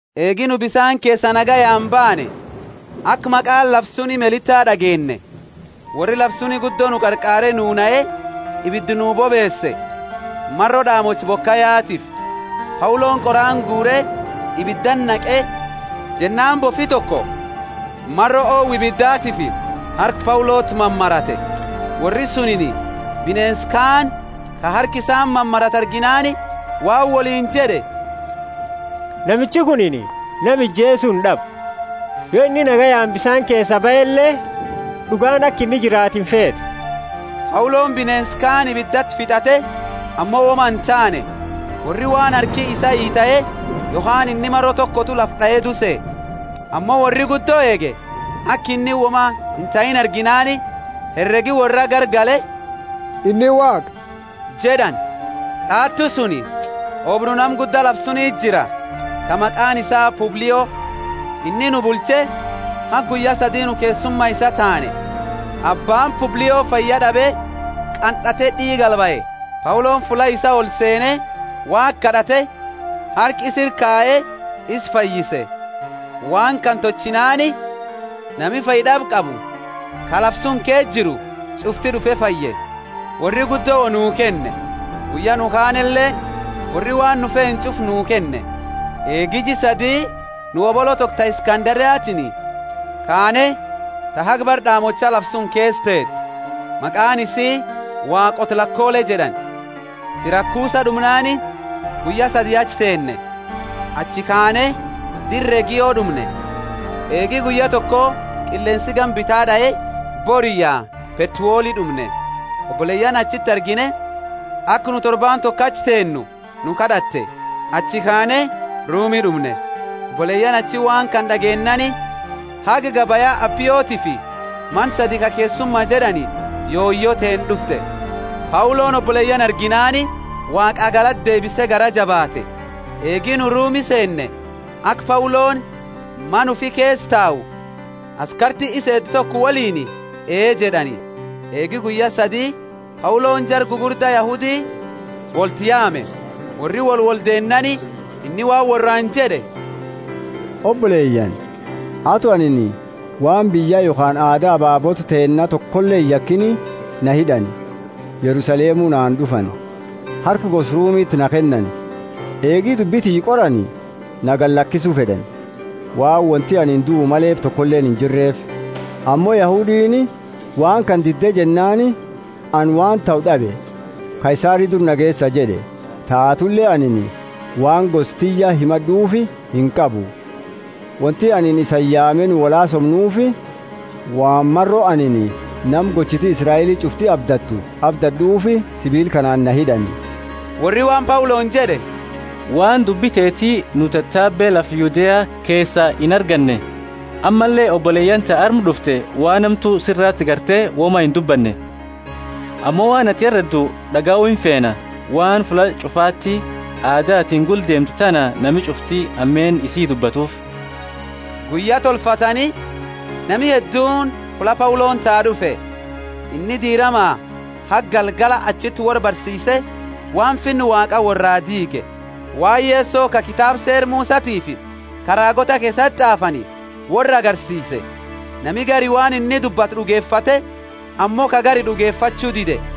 Eegi nu bisaani keesaa nagayaani baane, aka maqaani lafa suni Melita d'ageenne. Worri lafa suni guddo nuu qarqaare nu nahe, ibida nuu bobeese, maro d'aamocha bokayatiifi. Pauloni qoraani guure ibidati naqe jennaani bofi toko maro owa ibidatiifi harka Pauloti mamarate. Worri sunini bineensa kaani, ka harka isati maratu arginaani waan woliini jed'e, Namichi kunini nama ijeesu ind'abu; yo inni nagayaani bisaani keesaa bahele, d'ugaani aka inni jiraatu imfeetu. Pauloni bineensa kaani ibidati fit'ate ammo woma intaane. Worri waan harki isaa itae yokhaani inni maro tokotu lafa d'ae duu sehe. Ammo worri guddo eege, aka inni woma intahiini arginaani heregi worraa garagale, Inni Waaqa jed'ani. D'awatu suni, oobru nama gudda lafa suniti jira, ka maqaani isaa Publio. Inni nu bulche haga guyya sadi nu keessuma isaa taane. Abbaani Publio fayya d'abe qannate d'iiga albahe. Pauloni fulla isaa olseene Waaqa kad'ate, harka isa ira kaye isa fayyise. Waan kana tolchinaani nami fayyad'aba qabu, ka lafa suni keesa jiru ch'ufti d'ufe fayye. Worri guddo wo nuu kenne, guyya nu kaanele worri waan nu feenu ch'ufa nuu kenne. Eegi jia sadii nu hobolo toko ta Iskanderiatini kaane, ta haga bara d'aamocha lafa suni keesa teete; maqaani isii Waaqoota lakolee jed'ani. Sirakusa d'umnaani guyya sadi achi teenne. Achi kaane dira Regio d'umne. Eegi guyya toko qilleensi gama bita d'ae, boriyya Petuoli d'umne. Oboleyaani achiti argine, aka nu torbaani toko achi teennu nu kad'atte. Achi kaane Rumi d'umne. Oboleyaani achi waan kana d'ageennaani haga gabaya Apiotifi mana sadi ka keessuma jed'ani yoyo teenna d'ufte. Pauloni oboleyaani arginaani Waaqaa galata deebise garaa jabaate. Eegi nu Rumi seenne, aka Pauloni mana ufi keesa tau, askarti isa eedu toko woliini, ee jed'ani. Eegi guyya sadi Pauloni jara gugurda Yahudi wolti yaame. Worri wolwoldeennaani inni waan worraani jed'e, Oboleyaani, ato anini waan biyya yokhaani aada ababoota teenna tokole iyakini, na hid'ani, Yerusalemu na fuud'ani, harka gosa Rumiti na kennani. Eegi dubbi tiyya qorani, na gadilakisu fed'ani, waan wonti anini duu maleefi tokoleeni injirreefi. Ammo Yahudiini waan kana didde jennaani ani waan tahu d'abe. Kaisari dura na geesa jed'e. Taatule anini waan gosa tiyya himad'uufi inqabu. Wonti anini isani yaame nu wolhaasomnufi, waan maro anini nama gochiti Israeli ch'ufti abdattu abdad'ud'uufi sibiila kanaani na hid'ani. Worri waan Pauloni jed'e, Waan dubbi teeti nu tatabe lafa Yudea keesa inarganne, ammalle oboleyaani ta arma d'ufte waan hamtu sirati garte woma indubbanne. Ammo waan atini hereddu d'agayu imfeena, waan fulla ch'ufati aada atini gula deemtu tana nami ch'ufti hameenna isii dubbattufi. Guyya tolfatani, nami hedduuni fulla Pauloni tau d'ufe. Inni diirama haga galgala achiti worra barsiise waan finna Waaqaa worraa diige, waan Yeso ka kitaaba Seera Musatiifi ka raagoota keesati t'aafani worra agarsiise. Nami gari waan inni dubbate d'ugefate, ammo ka gari d'ugefachu dide.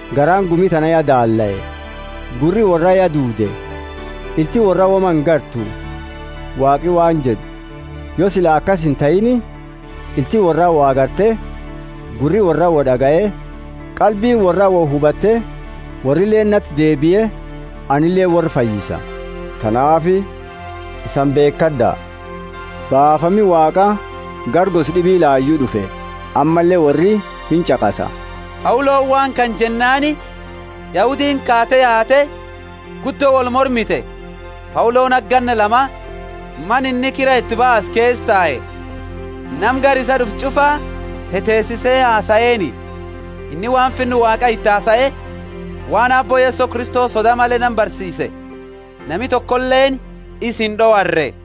Garaani gumi tana ya daallae. Gurri worraa ya duude, ilti worraa woma ingartu. Waaqi waan jed'u, Yo sila akasi intahiini, ilti worraa wo agarte, gurri worraa wo d'agaye, qalbiini worraa wo hubate worrileeni nati deebie, anileeni worra fayyisa. Tanaafi isani beekad'a, baafami Waaqa gara gosa d'ibi layu d'ufe, ammalle worri inch'aqasa! [ Pauloni waan kana jennaani Yahudiini kaate yaate guddo wolmormite.] Pauloni haga ganna lama mana inni kira iti baase keesa tae, nama gara isaa d'ufe ch'ufa teteesise hasaeeni. Inni waan Finna Waaqa iti hasae, waan Aabbo Yeso Kristo soda male nama barsiise, nami tokoleeni isa ind'owarre.